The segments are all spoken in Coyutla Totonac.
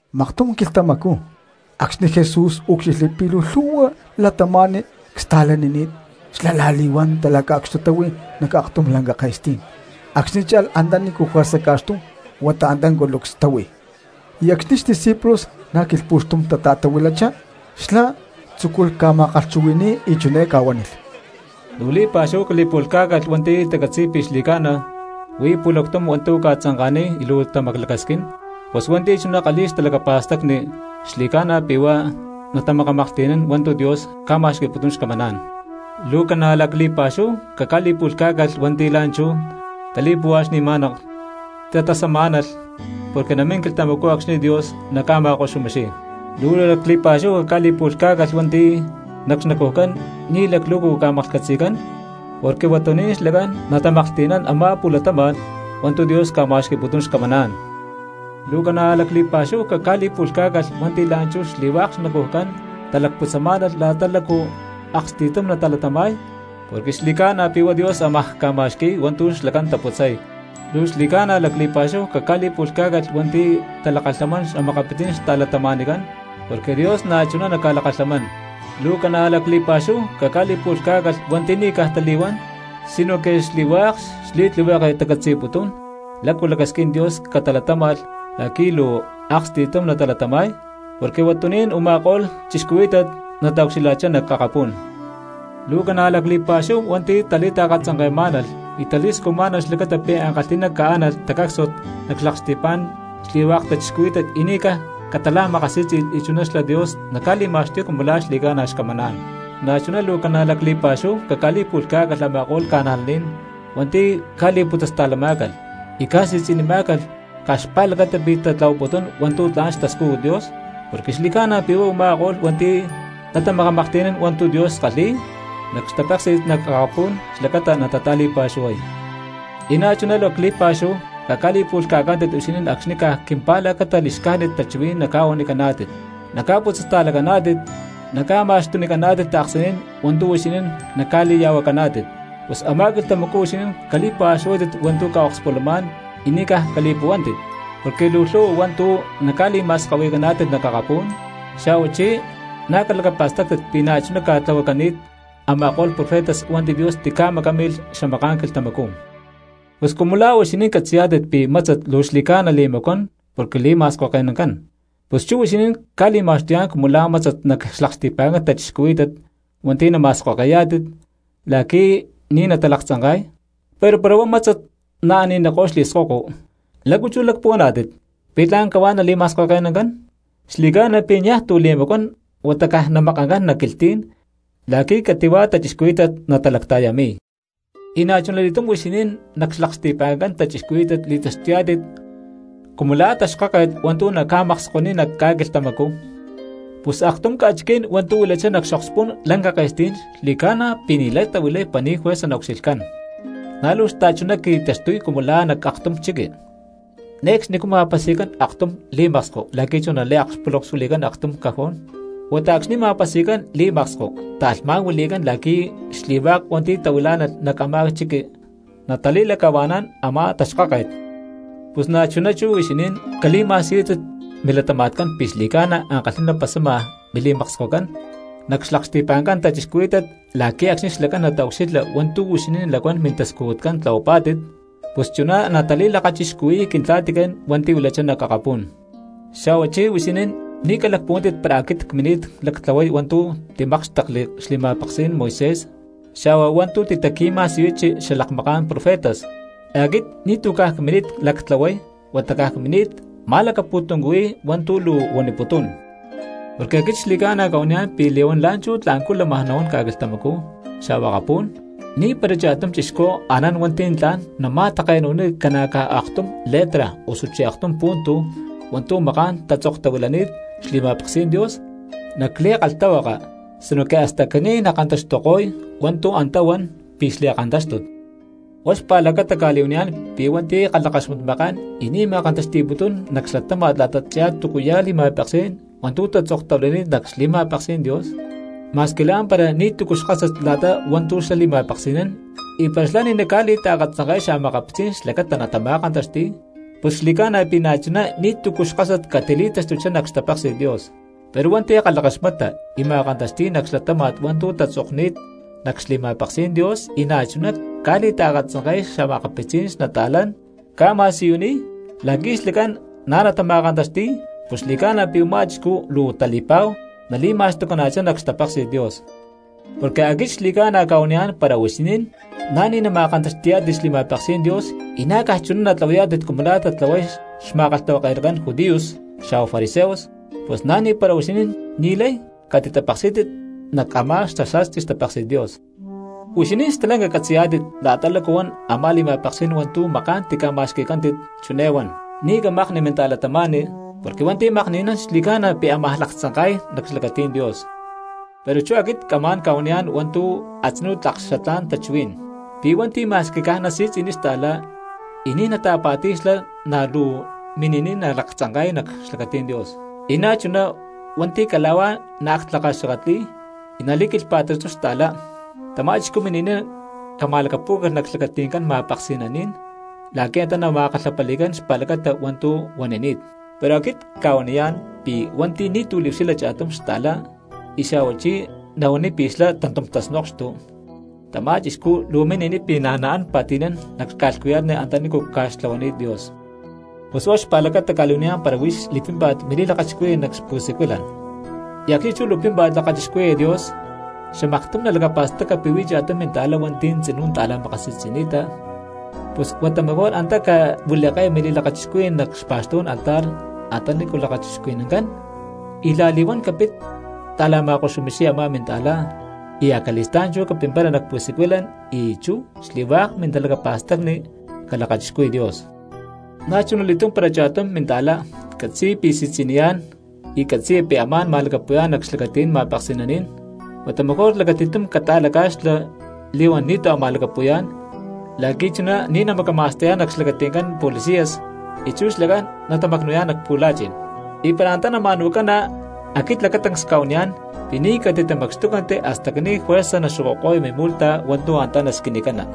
Maktum quilhtamacú acxni̠ Jesús úcxilhli pi̠ luu lhu̠hua cristianos xtasta̠lanini̠t, xlá la̠li̠huán talaca̠cxtutáhui nac aktum lanca ke̠stí̠n, acxni̠ cha̠lh antanícu juerza ca̠xtum huata antá culucs táhui, y acxni̠ xdiscípulos na̠ quilhpu̠xtum tata̠tahuilachá, xlá tzúculh ca̠ma̠kalhchuhui̠ni̠y, y chiné ca̠huánilh: —Luu li̠pa̠xúhu cali̠pu̠lhcá̠calh hua̠nti̠ tacatzi̠y pi̠ xli̠ca̠na huí pu̠lactum hua̠ntu̠ ca̠tzanka̠niy y luu tamaclacasquín, pus hua̠nti̠ chuná kalhi̠y xtalacapa̠stacni xli̠ca̠na pi̠ huá natamakamaklhti̠nán hua̠ntu̠ Dios ca̠ma̠xqui̠putún xcamaná̠n. ’Luu ca̠na̠ lacli̠pa̠xúhu caca̠li̠pu̠lhcá̠calh hua̠nti̠ la̠nchú tali̠puhuaxni̠má̠nalh y tatasamá̠nalh, porque namín quilhtamacú acxni̠ Dios naca̠ma̠koxumixiy. ’Luu lacli̠pa̠xúhu caca̠li̠pu̠lhcá̠calh hua̠nti̠ nac xnacujcán ni̠ laclu̠cu ca̠maklhcatzi̠cán, porque huatuní̠n xlacán natamaklhti̠nán a̠má pu̠latama̠n hua̠ntu̠ Dios ca̠ma̠xqui̠putún xcamaná̠n. ’Luu ca̠na̠ lacli̠pa̠xúhu caca̠li̠pu̠lhcá̠calh hua̠nti̠ la̠nchú xli̠hua̠k xnacujcán talacputzamá̠nalh la̠ta lácu luu aksti̠tum natalatama̠y, porque xli̠ca̠na pi̠ huá Dios amaj ca̠ma̠xqui̠y hua̠ntu̠ xlacán taputzay. ’Luu xli̠ca̠na lacli̠pa̠xúhu caca̠li̠pu̠lhcá̠calh hua̠nti̠ talakalhamán xa̠makapitzí̠n xta̠cristianoscán, porque Dios na̠chuná naca̠lakalhamán. ’Luu ca̠na̠ lacli̠pa̠xúhu caca̠li̠pu̠lhcá̠calh hua̠nti̠ ni̠ caj tali̠huán sinoque xli̠hua̠k xli̠tlihueke tacatzi̠putún lácu lacasquín Dios calatáma̠lh la̠qui̠ luu aksti̠tum natalatama̠y, porque huatuní̠n u̠ma̠ko̠lh cristianos nataucxilha̠chá nac akapú̠n. ’Luu ca̠na̠ lacli̠pa̠xúhu hua̠nti̠ tali̠taakatzanke̠má̠nalh y tali̠scujmá̠nalh xlacata pi̠ ankalhi̠ná caánalh tacácsuat nac xlaksti̠pa̠ncán xli̠hua̠k cristianos y ni̠ caj catala̠makasí̠tzi̠lh, y chuná xlá Dios naca̠li̠ma̠xtuy cumu la̠ xli̠ca̠na xcamaná̠n. ’Na̠chuná luu ca̠na̠ lacli̠pa̠xúhu caca̠li̠pu̠lhcá̠calh a̠ma̠ko̠lh cristianos hua̠nti̠ ca̠li̠putzasta̠lamá̠calh y ca̠si̠tzi̠nimá̠calh caj xpa̠lacata pi̠ tatlahuaputún hua̠ntu̠ tla̠n xtascújut Dios porque xli̠ca̠na pi̠ huá u̠ma̠ko̠lh hua̠nti̠ natamakamaklhti̠nán hua̠ntu̠ Dios kalhi̠y nac xtapéksi̠t nac akapú̠n xlacata natata̠li̠pa̠xuhuay. ’Y na̠chuná luu lacli̠pa̠xúhu caca̠li̠pu̠lhca̠cántit huixinín acxni̠ caj quimpa̠lacata li̠xcájnit tachuhuí̠n naca̠huanicaná̠tit, naca̠putzasta̠lacaná̠tit, naca̠ma̠xtunicaná̠tit ta̠ksaní̠n hua̠ntu̠ huixinín naca̠li̠ya̠huacaná̠tit. Pus a̠má quilhtamacú huixinín cali̠pa̠xuhuátit hua̠ntu̠ ca̠okspulamá̠n y ni̠ caj cali̠li̠puhuántit, porque luu lhu̠hua hua̠ntu̠ naca̠li̠ma̠skahui̠caná̠tit nac akapú̠n, xa̠huachí na̠ calacapa̠stáctit pi̠ na̠chuná ca̠tlahuacani̠t a̠ma̠ko̠lh profetas hua̠nti̠ Dios tica̠macámilh xamaká̠n quilhtamacú. ’Pus cumu la̠ huixinín catzi̠yá̠tit pi̠ mátzat luu xli̠ca̠na li̠macuán porque li̠ma̠skoke̠nancán, pus chú huixinín cca̠li̠ma̠xtuyá̠n cumu la̠ mátzat nac xlaksti̠pa̠ncán cristianos hua̠nti̠ nama̠skoke̠yá̠tit la̠qui̠ ni̠ natalaktzanka̠y. Pero para huá mátzat naani̠niko̠y xli̠skoko, ¿lácu chú lacpuhuaná̠tit pi̠ tla̠n cahuá nali̠ma̠skoke̠nancán? Xli̠ca̠na pi̠ niaj tu̠ li̠macuán huata mejor caj namakancán nac quilhtí̠n la̠qui̠ cati̠hua cristianos natalacta̠yami̠y. ’Y na̠chuna li̠túm huixinín nac xlaksti̠pa̠ncán cristianos li̠taxtuyá̠tit cumu la̠ taxkáket hua̠ntu̠ naca̠makskoniy nac ca̠quilhtamacú. Pus aktum ca̠chiquí̠n hua̠ntu̠ huilachá nac xokspú̠n lanca ke̠stí̠n xli̠ca̠na pi̠ ni̠lay tahuilay para ni̠ juerza naucxilhcán. Na̠ luu xta̠chuná qui̠taxtuy cumu la̠ nac aktum chiqui, ne̠cxnicú ma̠pasi̠cán aktum li̠maksko la̠qui̠ chú naliakpulonkxuili̠cán aktum cajón, huata acxni̠ ma̠pasi̠cán li̠maksko ta̠lhmá̠n huili̠cán la̠qui̠ xli̠hua̠k hua̠nti̠ tahuilá̠nalh nac a̠má chiqui natali̠lacahua̠nán a̠má taxkáket. Pus na̠chuná chú huixinín cali̠ma̠siyútit milatama̠tcán pi̠ xli̠ca̠na ankalhi̠ná pasama mili̠makskocán nac xlaksti̠pa̠ncán cristianos la̠qui̠ acxni̠ xlacán nataucxilha hua̠ntu̠ huixinín lacuán mintascujutcán tlahuapá̠tit pus chuná natali̠lakachixcuhui̠y Quintla̠ticán hua̠nti̠ huilachá nac akapú̠n. ’Xa̠huachí huixinín ni̠ calacpuhuántit para aquit cmini̠t lactlahuay hua̠ntu̠ timákxtekli xli̠ma̠peksí̠n Moisés xa̠huá hua̠ntu̠ titaqui̠ma̠siyuchi xalakmaká̠n profetas; aquit ni̠tu̠ caj cmini̠t lactlahuay, huata caj cmini̠t ma̠lacapu̠tuncuhui̠y hua̠ntu̠ luu huaniputún. Porque aquit xli̠ca̠na cca̠huaniyá̠n pi̠ li̠huán la̠nchú tla̠ncú lamaj nahuán ca̠quilhtamacú xa̠huá akapú̠n, ni̠para cha̠tum cristiano anán hua̠nti̠ tla̠n nama̠take̠nu̠niy ca̠na̠ caj aktum letra osuchí aktum punto hua̠ntu̠ maká̠n tatzoktahuilani̠t xli̠ma̠peksí̠n Dios nac li̠kalhtahuaka sinoque hasta caní nakantaxtuko̠y hua̠ntu̠ antá huan pi̠ xli̠kantáxtut. Huá xpa̠lacata cca̠li̠huaniyá̠n pi̠ hua̠nti̠ kalhakaxmatmakán y ni̠ ma̠kantaxti̠putún nac xlatáma̠t la̠tachá túcuya̠ li̠ma̠peksí̠n hua̠ntu̠ tatzoktahuilani̠t nac xli̠mápeksí̠n Dios ma̠squi la̠mpara ni̠tu̠cu xkásat la̠ta hua̠ntu̠ xlá li̠ma̠peksi̠nán, y para xlá ni̠ naca̠li̠taakatzanke̠y xa̠makapitzí̠n xlacata natama̠kantaxti̠y, pus xli̠ca̠na pi̠ na̠chuná ni̠tu̠cu xkásat catili̠taxtuchá nac xtapéksi̠t Dios. Pero hua̠nti̠ kalhakaxmata y ma̠kantaxti̠y nac xlatáma̠t hua̠ntu̠ tatzokni̠t nac xli̠ma̠peksí̠n Dios y na̠chuná ca̠li̠taakatzanke̠y xa̠makapitzí̠n cristianos, ca̠ma̠siyuniy la̠qui̠ xlacán na̠ natama̠kantaxti̠y, pus xli̠ca̠na pi̠ u̠má chixcú luu tali̠pa̠hu nali̠ma̠xtucaná̠chá nac xtapéksi̠t Dios. Porque aquit xli̠ca̠na cca̠huaniyá̠n para huixinín na̠ ni̠ nama̠kantaxti̠yá̠tit xli̠ma̠peksí̠n Dios y na̠ caj chuná natlahuayá̠tit cumu la̠ tatlahuay xma̠kalhtahuake̠nacán judíos xa̠huá fariseos, pus na̠ ni̠para huixinín ni̠lay catitapeksí̠tit nac a̠má xasa̠sti xtapéksi̠t Dios. ’Huixinín stalanca catzi̠yá̠tit la̠ta lácu huan a̠má li̠ma̠peksí̠n hua̠ntu̠ maká̠n tica̠ma̠xqui̠cántit, chiné huán: “Ni̠ camakni minta̠cristiano, porque hua̠nti̠ makni̠nán xli̠ca̠na pi̠ amaj laktzanka̠y nac xlacatí̠n Dios.” Pero chú aquit camá̠n ca̠huaniyá̠n hua̠ntu̠ a̠tzinú tlak xatlá̠n tachuhuí̠n, pi̠ hua̠nti̠ ma̠squi caj nasi̠tzi̠niy xta̠cristiano y ni̠ nata̠pa̠ti̠y xlá na̠ luu mini̠niy nalaktzanka̠y nac xlacatí̠n Dios. Y na̠chuná hua̠nti̠ cala̠huá naaktlakaxakatli̠y y nali̠quilhpa̠taxtuy xta̠cristiano, tamá chixcú mini̠niy cama̠lacapú̠calh nac xlacati̠ncán ma̠peksi̠naní̠n la̠qui̠ antá nama̠kalhapali̠cán xpa̠lacata hua̠ntu̠ huanini̠t. Pero aquit cca̠huaniyá̠n pi̠ hua̠nti̠ ni̠tu̠ liucxilha cha̠tum xta̠cristiano y xa̠hua chí nahuaniy pi̠ xlá tantum tasnokxtu, tamá cristiano luu mini̠niy pi̠ na̠ naán pa̠ti̠nán nac ca̠lhcuya̠tni antanícu ca̠xtlahuani̠t Dios. ’Pus huá xpa̠lacata cca̠li̠huaniyá̠n para huix li̠pímpa̠t mili̠lakachixcuhuí̠n nac pu̠siculan, y acxni̠ chú luu pímpa̠t lakachixcuhui̠ya Dios, xamaktum nalacapa̠staca pi̠ huí cha̠tum minta̠cristiano hua̠nti̠ tzinú ta̠la̠makasi̠tzi̠ni̠ta, pus huata mejor antá cahuili̠ke̠ya mili̠lakachixcuhuí̠n nac xpa̠xtú̠n altar antaní lakachixcuhui̠nancán, y la̠li̠huán capit ta̠la̠ma̠koxumixiya a̠má minta̠cristiano, y acali̠stá̠n chú capimpara nac pu̠siculan y chú xli̠hua̠k mintalacapa̠stacni calakachixcuhui Dios. ’Na̠chunali̠túm para cha̠tum minta̠cristiano catzi̠ya pi̠ si̠tzi̠niyá̠n y catzi̠ya pi̠ amá̠n ma̠lacapu̠yá̠n nac xlacatí̠n ma̠peksi̠naní̠n, huata mejor lacati̠tum cata̠laca̠xla li̠huán ni̠tu̠ a̠ ma̠lacapu̠yá̠n, la̠qui̠ chuná ni̠ namacama̠sta̠yá̠n nac xlacati̠ncán policías y chú xlacán natatamacnu̠yá̠n nac pu̠la̠chi̠n. Y para antá nama̠nu̠cana, aquit lacatancs cuaniyá̠n pi̠ ni̠ catitamacxtúcanti hasta caní juerza naxokoko̠ya mimu̠lhta hua̠ntu̠ antá nasquinicana.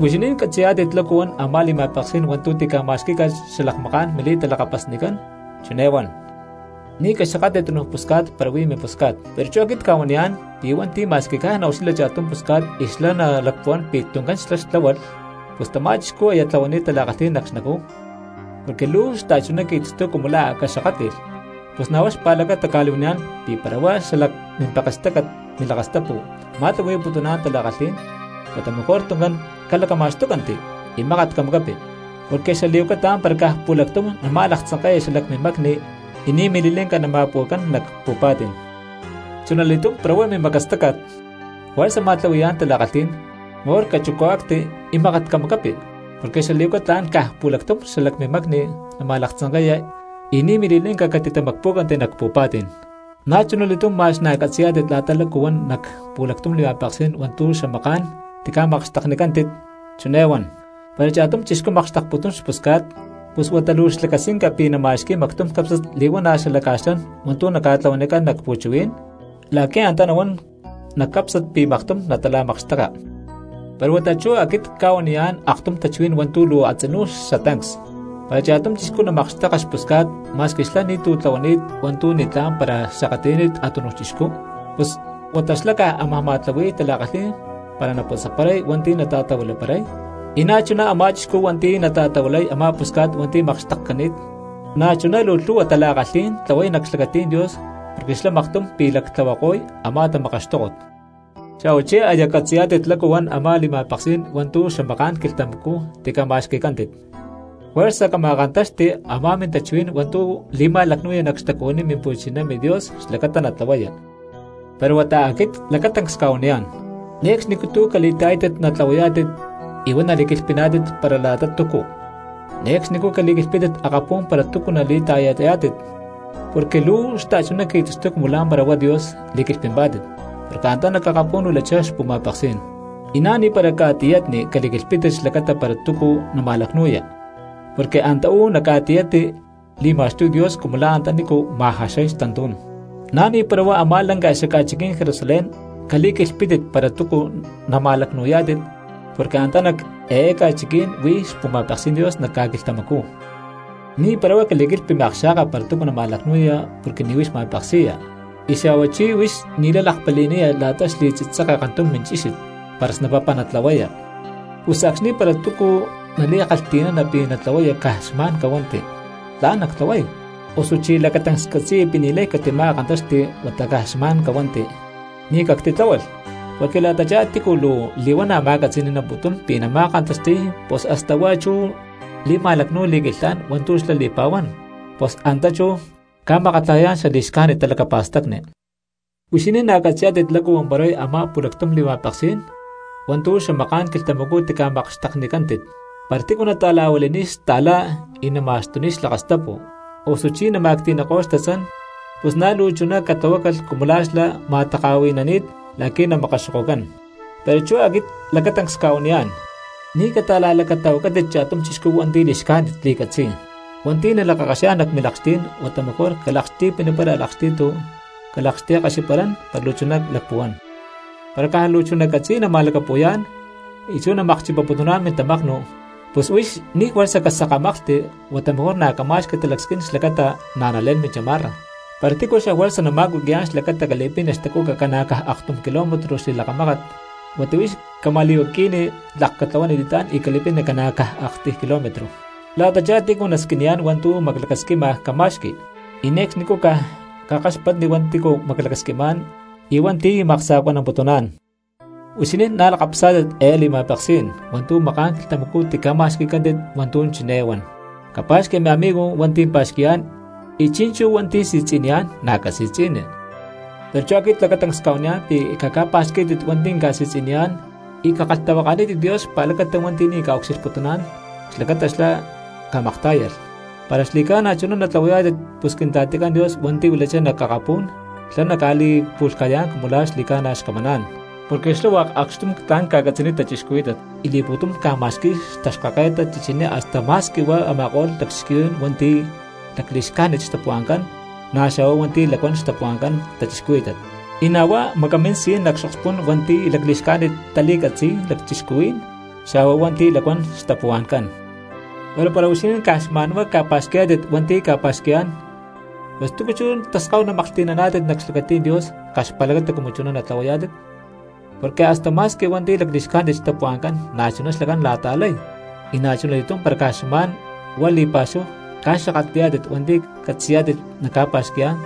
’Huixinín catzi̠yá̠tit lácu huan a̠má li̠ma̠peksí̠n hua̠ntu̠ tica̠ma̠xquí̠calh xalakmaká̠n mili̠talakapasnicán, chiné huán: “Ni̠ caxakatli tunuj pusca̠t para huí mimpusca̠t.” Pero chú aquit cca̠huaniyá̠n pi̠ hua̠nti̠ ma̠squi caj naucxilha cha̠tum pusca̠t y xlá nalacpuhuán pi̠ tuncán xlá xtláhualh, pus tamá chixcú aya tlahuani̠t tala̠kalhí̠n nac xnacú, porque luu xta̠chuná qui̠taxtuy cumu la̠ a̠ caxakátli̠lh. ’Pus na̠ huá xpa̠lacata cca̠li̠huaniyá̠n pi̠ para huá xalac mimpekstácat milakastapu ma̠tlahui̠putuná̠n tala̠kalhí̠n, huata mejor tuncán calacama̠xtúcanti y mákat camacapi; porque xali̠huaca tla̠n para caj pu̠lactum nama̠laktzanke̠ya xalac mimacni y ni̠ mili̠lanca natamacpu̠cana nac pu̠pa̠tí̠n. Chunali̠túm para huá mimacastácat juerza ma̠tlahui̠yá̠n tala̠kalhí̠n, mejor cachucúacti y mákat camacapi; porque xali̠huaca tla̠n caj pu̠lactum xalac mimacni nama̠laktzanke̠ya y ni̠ mili̠lanca catitamacpú̠canti nac pu̠pa̠tí̠n. ’Na̠chunali̠tum ma̠x na̠ catzi̠yá̠tit la̠ta lácu huán nac pu̠lactum li̠ma̠peksí̠n hua̠ntu̠ xamaká̠n tica̠makxteknicántit, chiné huan: “Para cha̠tum chixcú makxtekputún xpusca̠t, pus huata luu xlacasquinca pi̠ nama̠xqui̠y mactum cápsnat li̠huana̠ xalaca̠xlán hua̠ntu̠ naca̠tlahuanicán nac pu̠chuhuí̠n, la̠qui̠ antá nahuán nac cápsnat pi̠ maktum natala̠makxteka.” Pero huata chú aquit cca̠huaniyá̠n aktum tachuhuí̠n hua̠ntu̠ luu a̠tzinú xatancs: para cha̠tum chixcú namakxteka xpusca̠t ma̠squi xla̠ ni̠tu̠ tlahuani̠t hua̠ntu̠ ni̠tlá̠n para xakatli̠ni̠t a̠tunuj chixcú, pus huata xlá caj amaj ma̠tlahui̠y tala̠kalhí̠n para naputzaparay hua̠nti̠ nata̠tahuilaparay, y na̠chuná a̠má chixcú hua̠nti̠ nata̠tahuilay a̠má pusca̠t hua̠nti̠ makxtekcani̠t na̠chuná lhu̠hua tala̠kalhí̠n tlahuay nac xlacatí̠n Dios porque xlá maktum pi̠ lactlahuako̠y a̠má tamakaxtókot. ’Xa̠huachí aya catzi̠yá̠tit lácu huán a̠má li̠ma̠peksí̠n hua̠ntu̠ xamaká̠n quilhtamacú tica̠ma̠xqui̠cántit: “Juerza cama̠kántaxti a̠má mintachuhuí̠n hua̠ntu̠ li̠ma̠lacnu̠ya nac xtacuhuiní Mimpu̠chiná MiDios xlacata natlahuaya.” Pero huata aquit lacatancs cca̠huaniyá̠n: Ne̠cxnicú tu̠ cali̠ta̠yátit natlahuayá̠tit y huá nali̠quilhpiná̠tit para la̠ta túcu. Ne̠cxnicú cali̠quilhpítit akapú̠n para túcu nali̠ta̠yayá̠tit porque luu xta̠chuná qui̠taxtuy cumu la̠mpara huá Dios li̠quilhpimpá̠tit, porque antá nac akapú̠n huilachá xpu̠ma̠peksí̠n. Y na̠ ni̠para ca̠tiyatni cali̠quilhpítit xlacata para túcu nama̠lacnu̠ya, porque antá uú nac ca̠tiyatni li̠ma̠xtuy Dios cumu la̠ antanícu ma̠jaxay xtantú̠n. Na̠ ni̠para huá a̠má lanca xaca̠chiquí̠n Jerusalén cali̠quilhpítit para túcu nama̠lacnu̠yá̠tit porque antá nac eé ca̠chiquí̠n huí xpu̠ma̠peksí̠n Dios nac ca̠quilhtamacú. Ni̠para huá cali̠quilhpi miakxa̠ka para túcu nama̠lacnu̠ya porque ni̠ huix ma̠peksi̠ya, y xa̠hua chí huix ni̠lay lakpali̠niya la̠ta xli̠tzitzeke kantum minchíxit para snapapa natlahuaya. Pus acxni̠ para túcu nali̠kalhti̠nana pi̠ natlahuaya caj xma̠n cahuanti: “Tla̠n nactlahuay”, osuchi lacatancs catzi̠ya pi̠ ni̠lay catima̠kántaxti huata caj xma̠n cahuanti: “Ni̠ ctitláhualh”. Porque la̠tachá tícu luu li̠huana̠ ma̠catzi̠ni̠namputún pi̠ nama̠kantaxti̠y pus hasta huá chú li̠ma̠lacnu̠y li̠quilhán hua̠ntu̠ xlá li̠pa̠huán, pus antá chú ca̠makatlajayá̠n xali̠xcájnit talacapa̠stacni. ’Huixinín na̠ catzi̠yá̠tit lácu huamparay a̠má pu̠lactum li̠ma̠peksí̠n hua̠ntu̠ xamaká̠n quilhtamacú tica̠makxteknicántit: “Para tícu nata̠la̠huili̠niy xta̠cristiano y nama̠xtuniy xlakastapu, osuchi nama̠cti̠niko̠y xtatzán, pus na̠ luu chuná catlahuácalh cumu la̠ xlá ma̠taka̠hui̠nani̠t la̠qui̠ namakaxokocán.” Pero chú aquit lacatancs cca̠huaniyá̠n: Ni̠ cata̠la̠lacatahuacátit cha̠tum chixcú hua̠nti̠ li̠xcájnit li̠catzi̠y. Hua̠nti̠ nalakakaxiyá̠n nac milakxtí̠n huata mejor calakxti̠pinipara a̠lakxti̠tu calakxti̠kaxiparán para luu chuná lacpuhuán. Para caj luu chuná catzi̠y nama̠lacapu̠yá̠n y chú namakchipaputuná̠n mintamaknu, pus huix ni̠ juerza casakámaklhti, huata mejor na̠ cama̠xqui talacasquín xlacata na̠ nalé̠n minchamarra. Para tícu xafuerza nama̠cuqui̠yá̠n xlacata cali̠pini xtacuca ca̠na̠ caj aktum kilómetro xli̠lakamákat, huata huix cama̠li̠huaqui̠ni tlak catlahuani li̠tlá̠n y cali̠pini ca̠na̠ caj aktiy kilómetro. La̠tachá tícu nasquiniyá̠n hua̠ntu̠ maclacasquima cama̠xqui, y ne̠cxnicú caj cakaxpatni hua̠nti̠ maclacasquimá̠n y hua̠nti̠ maksa̠cuanamputuná̠n. ’Huixinín na̠ lakapasá̠tit ehe li̠ma̠peksí̠n hua̠ntu̠ maká̠n quilhtamacú tica̠ma̠xqui̠cántit hua̠ntu̠ chiné huán: “Capa̠xqui miamigo hua̠nti̠ pa̠xqui̠yá̠n, y chi̠nchú hua̠nti̠ si̠tzi̠niyá̠n na̠ casi̠tzi̠ni.” Pero chú aquit lacatancs cca̠huaniyá̠n pi̠ caca̠pa̠xquí̠tit hua̠nti̠ ca̠si̠tzi̠niyá̠n y cakalhtahuakanítit Dios xpa̠lacata hua̠nti̠ ni̠ ca̠ucxilhputuná̠n xlacata xlá camaktá̠yalh. Para xli̠ca̠na chuná natlahuayá̠tit pus Quintla̠ticán Dios hua̠nti̠ huilachá nac akapú̠n xlá naca̠li̠pu̠lhca̠yá̠n cumu la̠ xli̠ca̠na xcamaná̠n. Porque xlá hua̠k acxtum tla̠n ca̠catzi̠niy cristianos y li̠pu̠tum ca̠ma̠xqui̠y xtaxkáket chichiní hasta ma̠squi huá a̠ma̠ko̠lh lacchixcuhuí̠n hua̠nti̠ lacli̠xcájnit xtapuhua̠ncán, na̠ xa̠hua hua̠nti̠ lacuán xtapuhua̠ncán cristianos, y na̠ huá macamín si̠n nac xokspu̠ncán hua̠nti̠ lacli̠xcájnit tali̠catzi̠y lacchixcuhuí̠n xa̠hua hua̠nti̠ lacuán xtapuhua̠ncán. Pero para huixinín caj xma̠nhuá ca̠pa̠xqui̠yá̠tit hua̠nti̠ na̠ ca̠pa̠xqui̠yá̠n, pus ¿túcu chú ya̠ taskáhu namaklhti̠naná̠tit nac xlacatí̠n Dios caj xpa̠lacata cumu chuná natlahuayá̠tit? Porque hasta ma̠squi hua̠nti̠ lacli̠xcájnit xtapuhua̠ncán na̠chuná xlacán tala̠ta̠lay. Y na̠chuna li̠túm para caj xma̠n huá li̠pa̠xúhu ca̠xakatli̠yá̠tit hua̠nti̠ catzi̠yá̠tit na̠ ca̠pa̠xqui̠yá̠n,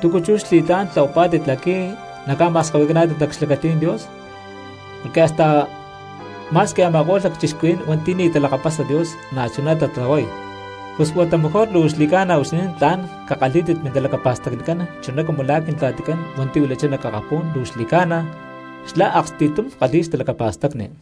¿túcu chú xli̠tlá̠n tlahuapá̠tit la̠qui̠ naca̠ma̠skahui̠caná̠tit nac xlacatí̠n Dios? Porque hasta ma̠squi a̠ma̠ko̠lh lacchixcuhuí̠n hua̠nti̠ ni̠ talakapasa Dios na̠chuná tatlahuay. Pus huata mejor luu xli̠ca̠na huixinín tla̠n cakalhí̠tit mintalacacapa̠stacnicán chuná cumu la̠ Quintla̠ticán hua̠nti̠ huilachá nac akapú̠n luu xli̠ca̠na xlá aksti̠tum kalhi̠y xtalacapa̠stacni.